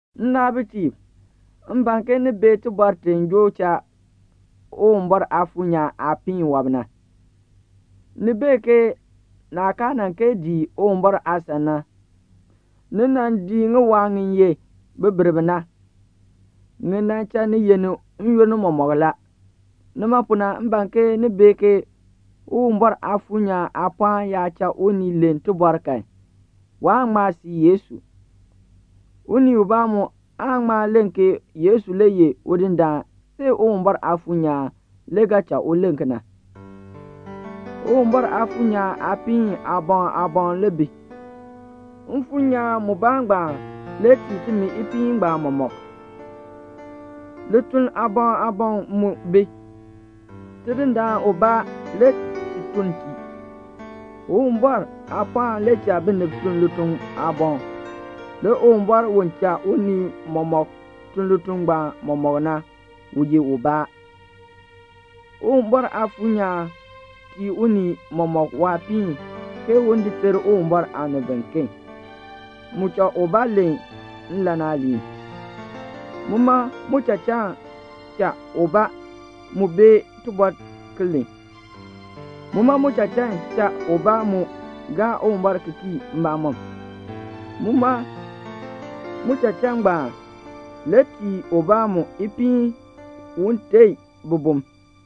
Nnaabitiib, m ban ke ni bee tibɔr ti joo cha Uwumbɔr Aafuur nyaan aapiin wɔb na. Ni bee ke naah kaa nan kee dii Uwumbɔr aasan na, ni nan dii ŋiwaa ŋi ye bibirb na. Ŋi nan cha ni yenni n-yoonn mɔmɔk la. Nima pu na m ban ke ni bee ke Uwumbɔr Aafuur nyaan aapɔɔn yaa cha unii len tibɔr kan, waan ŋma sii Yesu. Unii ubaa mu aan ŋma len ke Yesu le ye Udindaan see Uwumbɔr Aafuur nyaan le ga cha u len kena. Uwumbɔr Aafuur nyaan aapiin aaboŋ aaboŋ le bi; Mfuur nyaan mubaa ngbaan le tii timi ipiin ngbaan mɔmɔk. Lituln aaboŋ aaboŋ mu bi; Tidindaan ubaa le ti tun tii. Uwumbɔr aapɔɔn le cha binib tun lituln aaboŋ. Le Uwumbɔr u cha unii mɔmɔk tun lituln ngbaan mɔmɔk na, u ye ubaa. Uwumbɔr Aafuur nyaan tii unii mɔmɔk waapiin, ke un di ter Uwumbɔr aanib biken. Mu cha ubaa len nlan aaliin. Muma muchachaan cha ubaa mu bee tibɔr ki len. Muma muchachaan cha ubaa mu gaa Uwumbɔr ki kii mbamɔm. Muma muchachaan ngbaan le tii ubaa mu ipiin un teei bibum.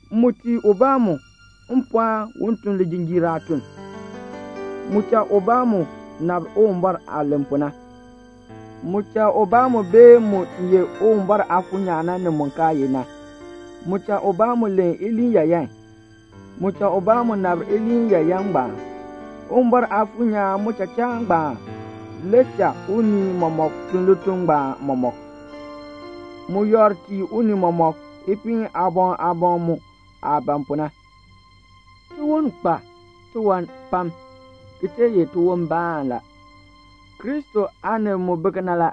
Mu tii ubaa mu mpɔɔn un tun lijinjiir aatun. Mu cha ubaa mu nabr Uwumbɔr aah len pu na. Mu cha ubaa mu bee mu ye Uwumbɔr Aafuur nyaan na, ni mu kaa ye na. Mu cha ubaa mu len iliin yaayan. Mu cha ubaa mu nabr iliin yaayan ngbaan. Uwumbɔr Aafuur nyaan muchachaan ngbaan le cha unii mɔmɔk tun lituln ngbaan mɔmɔk. Mu yakr tii unii mɔmɔk ipiin aaboŋ aaboŋ mu aah ban pu na. Tiwon kpa tiwan pam, ki tee ye tiwonbaan la. Kristo aanib mu bi kena la.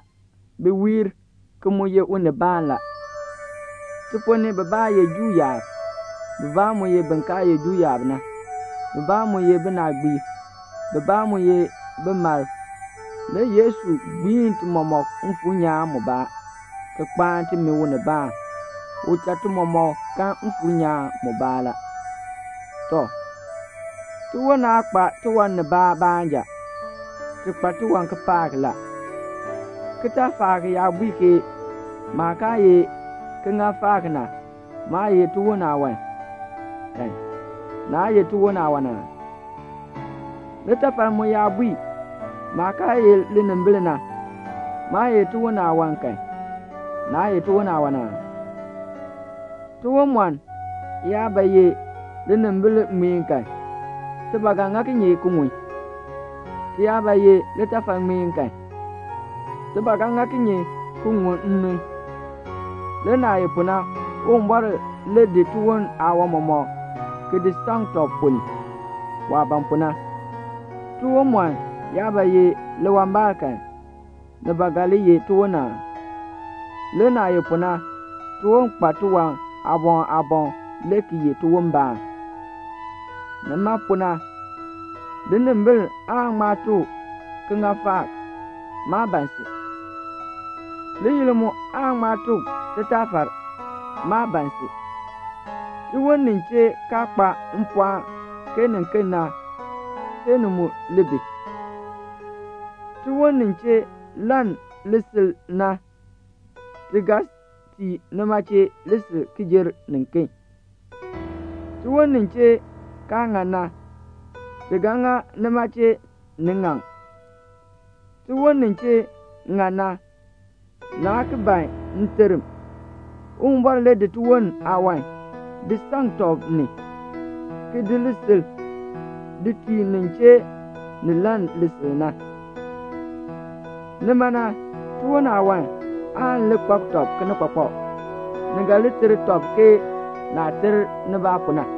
Bi wiir, ki mu ye unibaan la. Ti ponn ni bibaa ye Juu yaab, bibaa mu ye bin kaa ye Juu yaab na, bibaa mu ye binaagbiib, bibaa mu ye bimalb, le Yesu gbiin ti mɔmɔk Mfuur nyaan mubaa ni, ki kpaan timi unibaan. U cha ti mɔmɔk kan Mfuur nyaan mubaa la. Tɔ, tiwon aa kpa tiwan nibaa baanja. Ti kpa tiwan kipaak la. Kitaafaak yaa bui ke "Maah kaa ye kiŋaafaak na, maa ye tiwon aawan" kan, naa ye tiwon aawan aa? Litafal mu yaa bui, "Maah kaa ye linimbil na, maa ye tiwon aawan" kan, naa ye tiwon aawan aa? Tiwonmɔn yaa ba ye linimbil ŋmeen kan, ti ba ga ŋa kinye ki ŋun? Ti yaa ba ki ye litafal ŋmeen kan, ti ba ga ŋa kinye ki ŋun nnun? Le naah ye pu na, Uwumbɔr le di tiwon aawan mɔmɔk ki di saŋ tɔb ponn ni, waah ban pu na. Tiwonmɔn yaa ba ye liwambaal kan, ni ba ga li ye tiwon aa? Le naah ye pu na, tiwon kpa tiwan aaboŋ aaboŋ, le ki ye tiwonbaan. Nima pu na linimbil aan ŋma tuk kiŋaafaak, "Maa ban si." Liyil mu aan ŋma tuk titaafar, "Maa ban si." Tiwon nin chee kaa kpa mpɔɔn ke niken na, see ni mu li bi. Tiwon nin chee lann lisil na, ti ga tii nima chee lisil ki jer niken. Le tiwon nin chee kaa ŋan na, ti ga ŋa nima chee ni ŋaŋ. Le tiwon nin chee ŋan na, naa ki ban nterm. Uwumbɔr le di tiwon aawan di saŋ tɔb ni, ki di lisil di tii nin chee ni lann lisil na. Nima na, tiwon aawan aan li kpak tɔb kinikpakpak, ni ga li ter tɔb ke naah ter nibaa pu na.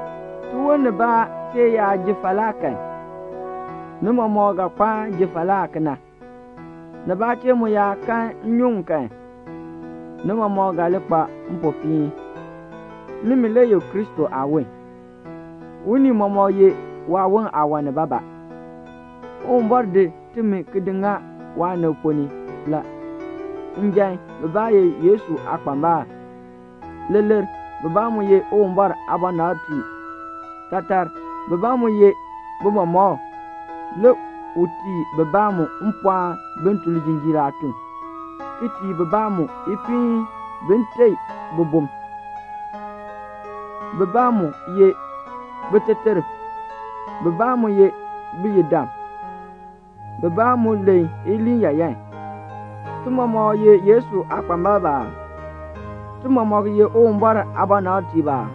Tiwon nibaa chee yaa ji falaa kan, ni mɔmɔk ga kpaan ji falaa kena. Nibaa chee mu yaa kan nnyuŋ kan, ni mɔmɔk ga li kpa mpopiin. Nimi le ye Kristo aawon. Unii mɔmɔk ye waawon aawan nibaabaa. Uwumbɔr di timi ki di ŋa waanib ponn ni la; njan, bibaa ye Yesu aakpambalb; leeler, bibaa mu ye Uwumbɔr aabɔnabtiib; taatar, bibaa mu ye bimɔmɔkb; le u tii bibaa mu mpɔɔn bin tun lijinjiir aatun; ki tii bibaa mu ipiin bin teei bibum; bibaa mu ye biteterb; bibaa mu ye biyidam; bibaa mu len iliin yaayan. Ti mɔmɔk ye Yesu aakpambalb aa? Ti mɔmɔk ye Uwumbɔr aabɔnabtiib aa?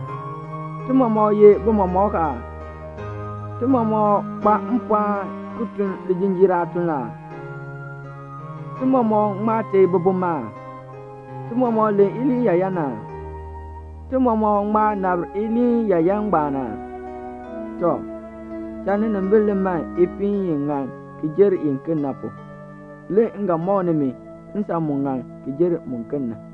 Ti mɔmɔk ye bimɔmɔkb aa? Ti mɔmɔk kpa mpɔɔn ki tun lijinjiir aatun aa? Ti mɔmɔk ŋma teei bibum aa? Ti mɔmɔk len iliin yaayan aa? Ti mɔmɔk ŋma nabr iliin yaayan ngbaan aa? Tɔ, cha ninimbil li man ipiin i ŋan ki jer iken na pu. Le m ga mɔk nimi nsan mu ŋan ki jer muken na.